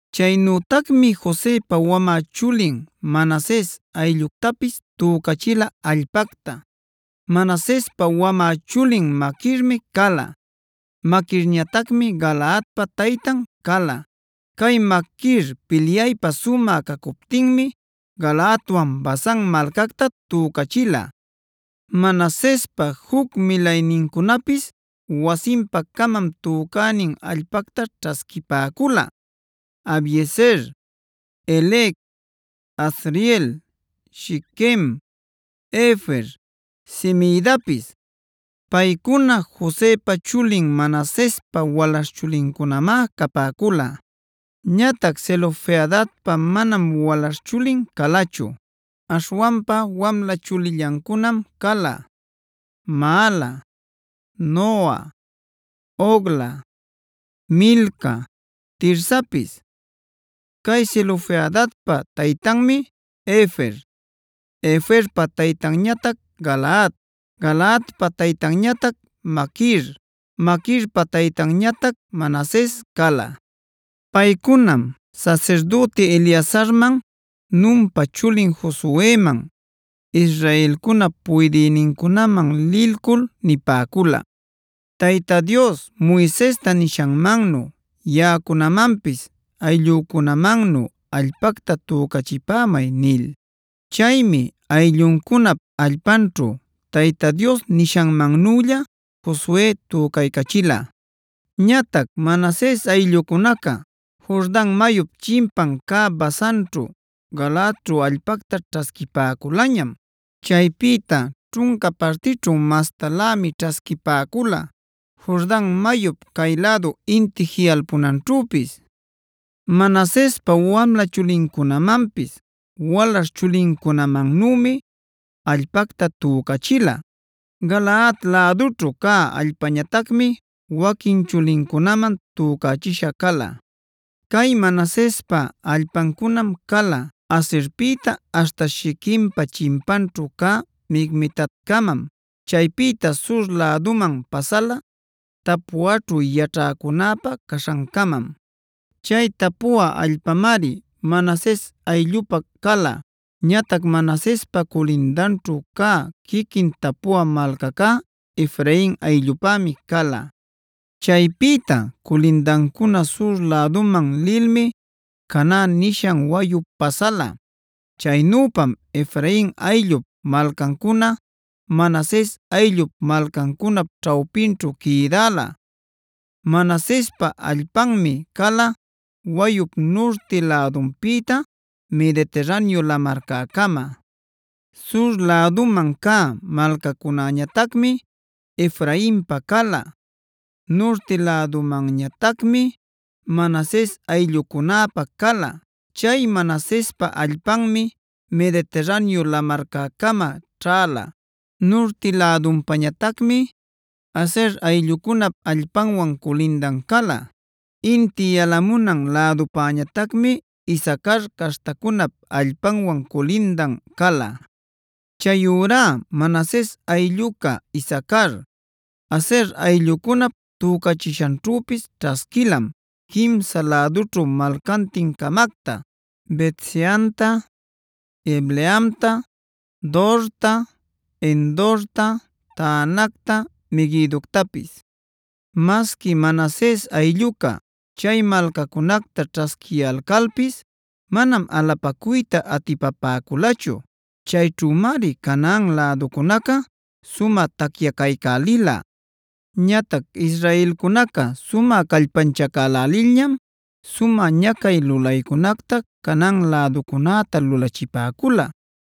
Chaynütacmi Josepa wamä chulin Manases aylluctapis tücachila allpacta. Manasespa wamä chulin Maquirmi cala; Maquirñatacmi Galaadpa taytan cala. Cay Maquir pilyaypä sumä cacuptinmi Galaadtawan Basan malcacta tücachila. Manasespa juc milaynincunapis wasinpa-camam tücänin allpacta ćhasquipäcula: Abiezer, Helec, Asriel, Shiquem, Hefer, Semidapis. Paycuna Josepa chulin Manasespa walaśh chulincunamá capäcula. Ñatac Zelofehadpa manam walaśh chulin calachu; aśhwanpa wamla chulillancunam cala: Maala, Noa, Hogla, Milca, Tirsapis. Cay Zelofehadpa taytanmi Hefer, Heferpa taytanñatac Galaad, Galaadpa taytanñatac Maquir, Maquirpa taytanñatac Manases cala. Paycunam sasirdüti Eleazarman, Nunpa chulin Josueman, israelcunap puydïnincunaman lilcul nipäcula: “Tayta Dios Moisesta nishanmannu yaꞌacunamanpis ayllücunamannu allpacta tücachipämay” nil.a Chaymi aylluncunap allpanćhu Tayta Dios nishanmannülla Josue tücaycachila. Ñatac Manases ayllucunaca Jordan mayup chimpan cä Basanćhu, Galaadćhu allpacta ćhasquipäculañam. Chaypïta ćhunca partićhu mastalämi ćhasquipäcula Jordan mayup cay-lädu inti jiꞌalpunanćhüpis. Manasespa wamla chulincunamanpis walaśh chulincunamannümi allpacta tücachila. Galaad lädućhu cä allpañatacmi waquin chulincunaman tücachisha cala. Cay Manasespa allpancunam cala: Aserpïta aśhta Shiquempa chimpaćhu cä Micmetatcamam. Chaypïta sur läduman pasala Tapuaćhu yaćhäcunäpä caśhancamam. Chay Tapua allpamari Manases ayllupä cala. Ñatac Manasespa culindanćhu cä quiquin Tapua malcacá Efrain ayllupämi cala. Chaypïta culindancuna sur läduman lilmi Caná nishan wayup pasala. Chaynüpam Efrain ayllup malcancuna Manases ayllup malcancunap ćhawpinćhu quïdäla. Manasespa allpanmi cala wayup nurti lädunpïta Mediterraneo lamarcäcama. Sur läduman cä malcacunäñatacmi Efrainpa cala; nurti lädumanñatacmi Manases ayllucunäpä cala. Chay Manasespa allpanmi Mediterraneo lamarcäcama ćhäla. Nurti lädunpañatacmi Aser ayllucunap allpanwan culindan cala; inti yalamunan lädupañatacmi Isacar caśhtacunap allpanwan culindan cala. Chayurá Manases aylluca Isacar, Aser ayllucunap tücächishanćhüpis ćhasquilam quimsan lädućhu malcantin-camacta: Bet-seanta, Ibleamta, Dorta, Endorta, Taanacta, Meguidoctapis. Masqui Manases aylluca chay malcacunacta ćhasquiyalcalpis manam alapacuyta atipapäculachu. Chayćhümari Canaan läducunaca sumä tacyacaycälila. Ñatac israelcunaca sumä callpanchacälälilñam sumä ñacay lulaycunacta Canaan läducunäta lulachipäcula.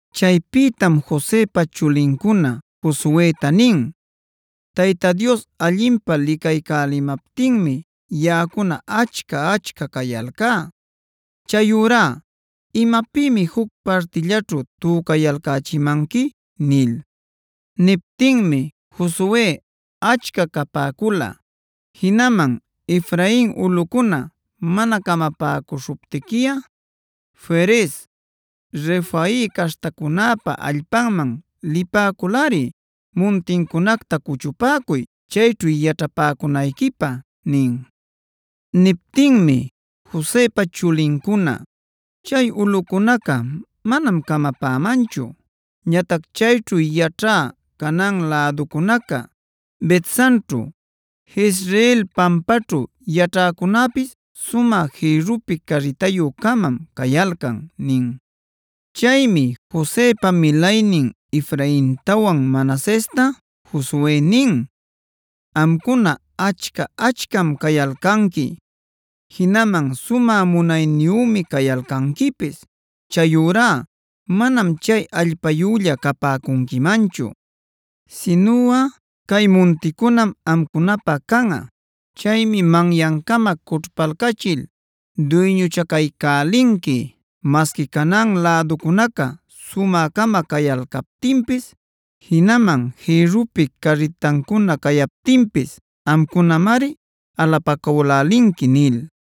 Chaypïtam Josepa chulincuna Josueta nin: “Tayta Dios allinpä licaycälimaptinmi yaꞌacuna achca-achca cayalcá. Chayurá ¿imapïmi juc partillaćhu tücayalcächimanqui?” nil. Niptinmi Josue: “Achca capäculꞌa, jinaman Efrain ulꞌucuna mana camapäcuśhuptiquiꞌa Ferez, Refai caśhtacunäpa allpanman lipäculꞌari muntincunacta cuchupäcuy, chayćhu yaćhapäcunayquipä” nin. Niptinmi Josepa chulincuna: “Chay ulꞌucunaca manam camapämanchu. Ñatac chayćhu yaćhä Canaan läducunaca, Bet-sanćhu, Jezreel pampaćhu yaćhäcunäpis sumä jïrrupi carritayü-camam cayalcan” nin. Chaymi Josepa milaynin Efraintawan Manasesta Josue nin: “Amcuna achca-achcam cayalcanqui; jinaman sumä munayniyümi cayalcanquipis. Chayurá manam chay allpayülla capäcunquimanchu. Sinuꞌa cay munticunam amcunapä canꞌa. Chaymi manyancama cućhpalcachil duyñuchacaycälinqui. Masqui Canaan läducunaca sumä-cama cayalcaptinpis, jinaman jïrrupi carritancuna cayaptinpis amcunamari alapacülälinqui” nil.